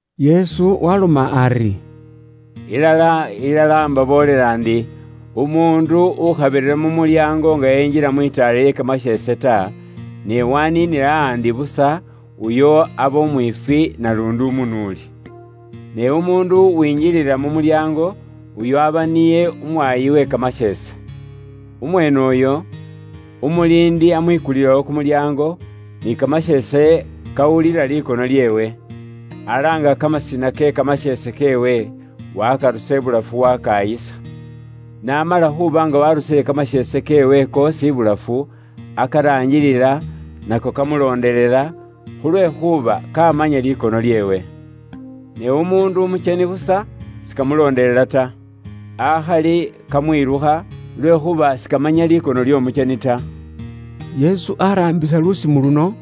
Yesu waaloma ari, “Ilala, ilala, imbaboolela ndi, umuundu ukhabirira mu mulyaango nga enjila mu litaala lye kamasheese, ne waniinila ahandi busa, uyo aba umwiifwi, naluundi umunuuli. Ne umuundu uwingilila mu mulyaango, uyo aba niye umwaayi uwe kamasheese. Umweene uyo, umuliindi amwikulilawo kumulyaango, ni kamasheese kawulila likono lyeewe. Alaanga kamasina ke kamasheese keewe, wakarusa ibulafu wakayisa. N'amala khuuba nga waarusile kamasheese keewe koosi ibulafu, akaraangilila, nako kamulondelela, khulwekhuuba kaamanya likono lyeewe. Ne umuundu umukyeni busa sikamulondelela ta. Akhali kamwilukha, lwekhuuba sikamanya likono ly'omukyeni ta.” Yesu araambisa lusimo luno,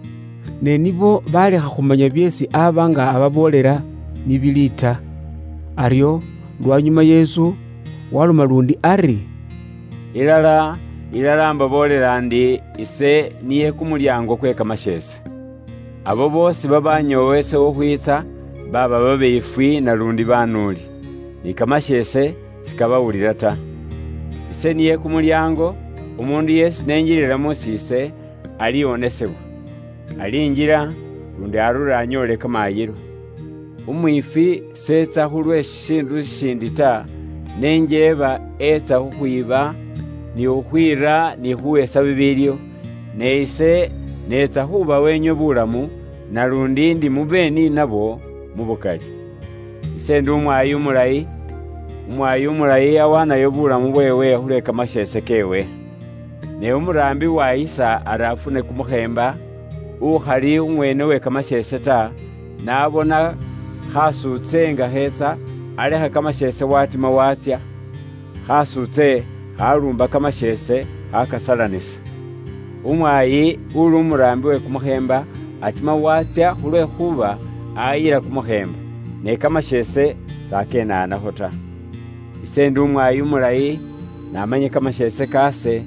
ne nibo balekha khumanya byeesi aba nga ababoolela, ni bili ta. Aryo lwanyuma Yesu waloma luundi ari: “Ilala, ilala, imbaboolela ndi, ise niye kumulyaango kwe kamasheese. Abo boosi babaanyoowa ise khukhwiitsa, baaba babiifwi, naluundi baanuuli. Ni kamasheese sikaabawulila ta. Ise niye kumulyaango. Umuundu yeesi ni enjilila mus'iise, aliwonesebwa. Alinjila, luundi arure anyoole kamaayilo. “Umwiifwi s'etsa khu lwe shishiindu shishiindi ta, ne njeeba eetsa khukhwiiba, ni khukhwiira, ni khuuhesa bibiiliwo. Ne ise neetsa khuubawa inywe buulamu, naluundi ndi mube ni nabwo mu bwitsufu. “Ise ndi umwaayi umulayi. Umwaayi umulayi awaanayo bulamu bweewe khulwe kamasheese keewe. Ne umuraambi uwaayisa ari afune kumukheemba, ukhali umweene uwe kamasheese ta, n'abona khatsuutse nga kheetsa, alekha kamasheese waatima waatsya, khatsuutse khaluumba kamasheese, khaakasalanisa. Umwaayi uli umuraambi uwe kumukheemba atima waatsya, khulwekhuuba ayila kumukheemba, ne kamasheese s'akenaanakho ta. “Ise ndi umwaayi umulayi, namanya kamasheese kaase,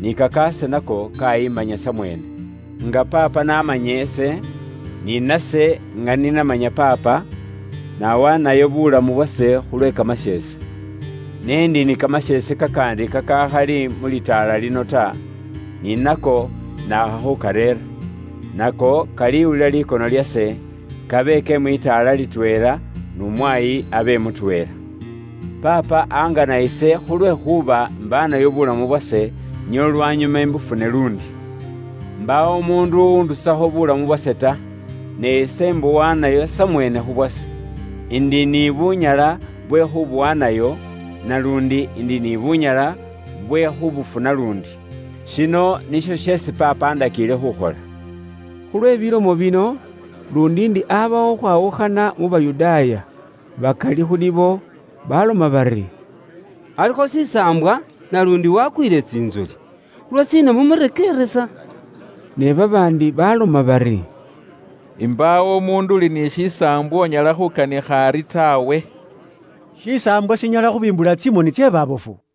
ni kakaase nako kaayimanya samweene. Nga Paapa n'amanya ise, ni nase nga ni namanya Paapa, nawaanayo bulamu bwase khulwe kamasheese. Ne ndi ni kamasheese kakaandi kakakhali mu litaala lino ta; ni nako naakha khukareera. Nako kaliwulila likono lyase, kabe ke mwitaala litweela, n'umwaayi abe mutweela. “Paapa angana ise khulwekhuuba imbaanayo bulamu bwase, nio lwanyuma imbufune luundi. Mbaawo umuundu uwundusakho bulamu bwase ta; ne ise imbuwaanayo samweene khu bwase. Indi ni bunyala bwe khubuwaanayo, naluundi ndi ni bunyala bwe khubufuna luundi. Shino nisho sheesi Paapa andakiile khukhola.” Khulwe bilomo bino, luundi ndi abawo khukhwawukhana mu Bayudaaya. Bakali khu nibo baloma bari, “Alikho shisaambwa, naluundi wakwiile tsintsoli. Lwashiina mumurekeeresa?” Ne babaandi baloma bari, “Mbaawo umuundu uli ni kimisaambwa unyala khukanikha ari taawe. Shisaambwa shinyala khubimbula tsimoni tsye baabofu?”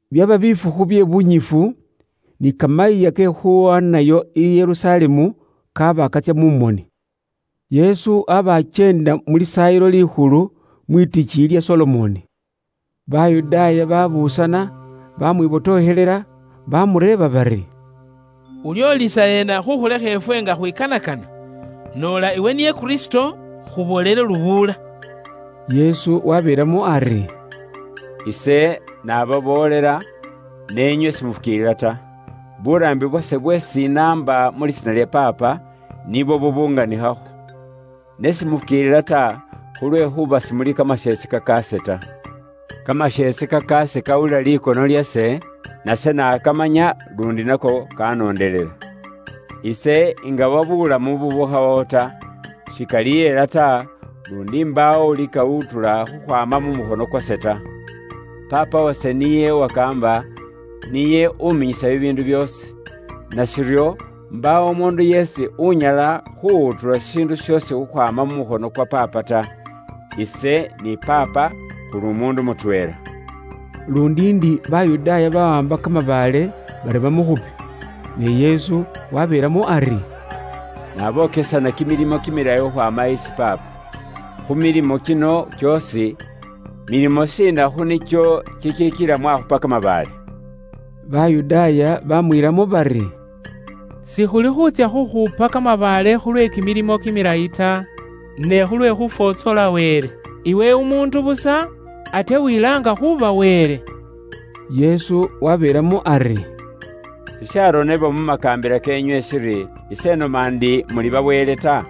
Byaba bifukhu bye bunyifu, ni Kamayiiya ke Khuwaanayo i Yerusalemu kaaba katsya mu moni. Yesu aba akyeenda mu Lisaayilo Likhulu, mwitikiiyi lya Solomoni. Babaandu babuusana, bamwibotokhelela bamureeba bari, “Ulyoolisa ena khukhulekha ifwe nga khwikanakana? Noola iwe niye Kristo, khuboolele lubuula.” Yesu wabeelamo ari, “Ise nababoolela, ne inywe simufukiilila ta. Buuraambi bwase bweesi inaamba mu lisiina lya Paapa, nibwo bubunganikhakho. Ne simufukiilila ta, khulwekhuuba simuli kamasheese kakaase ta. Kamasheese kakaase kawulila likono lyase, nase nakamanya, luundi nako kanondelela. Ise ingawa buulamu bubukhawawo ta. Shikalihela ta, luundi mbaawo ulikawutula khukhwaama mu mukhono kwase ta. Paapa wase niye uwakaamba ise, niye uminyisa bibiindu byoosi, nashiryo mbaawo umuundu yeesi unyala khuwutula shishiindu shoosi khukhwaama mu mukhono kwa Paapa ta. Ise ni Paapa khuli umuundu mutweela.” Luundi ndi Bayudaaya bawaamba kamabaale bari bamukhupe. Ne Yesu wabeelamo ari, “Nabookesana kimilimo kimilayi khukhwaama isi Paapa, khu milimo kino kyoosi, milimo shiina khu nikyo kikila mwakhupa kamabaale?” Bayudaaya bamwiilamo bari, “Sikhuli khuutsya khukhupa kamabaale khulwe kimilimo kimilayi ta, ne khulwe khufwotsola Wele. Iwe umuundu busa, ate wilaanga khuuba Wele.” Yesu wabeelamo ari, “Sisharonebwa mu makaambila keenywe shiri, ‘Ise inoma ndi muli ba wele’ ta?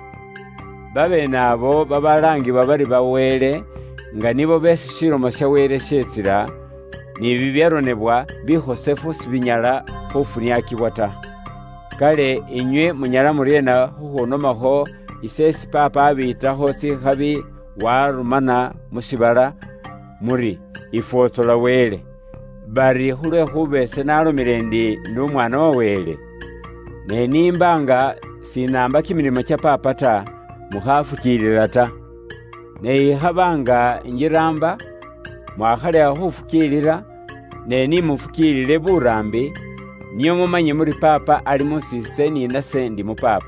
Babeene abo babalaangibwa bari ba wele, nga nibo beesi Ilomo ya Wele yeetsila, ni bibyaronebwa bikhosefu sibinyala khuufuniaakibwa ta. Kale inywe munyala muryeena khukhuunomakho ise, isi Paapa abiitakho tsikhabi, waarumana mu shiibala, muri ifwotsola Wele, bari khulwekhuuba ise naalomile ndi, ‘Ise indi umukhosefu khukhwaama isi Wele?’ Ne ni imba nga sinaamba kimilimo kya Paapa, mukhaafukiilila ta. Ne ikhaba nga injiraamba, mwakhalekha khufukiilila, ne ni mufukiilile buraambi, nio mumanye muri Paapa ali mus'iise, ni nase ndi mu Paapa.”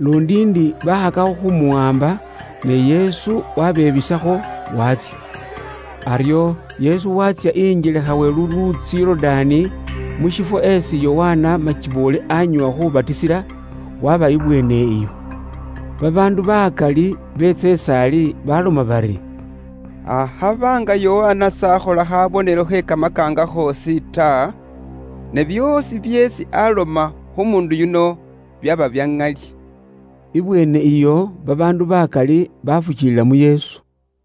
Luundi ndi bakhakakho khumuwaamba, ne Yesu wabebisakho waatsya. Aryo Yesu waatsya injelekha we luluutsi Yorudaani, mu shifwo esi Yokana makiboole anyoowa khubatisila, waba ibweene iyo. Babaandu bakali beetsa is'ali baloma bari, “Akhaba nga Yokana s'akhola khabonelo khe kamakaanga khoosi ta, ne byoosi byeesi aloma khu muundu yuno, byaba bya ŋali.” Ibweene iyo, babaandu bakali bafukiilila mu Yesu.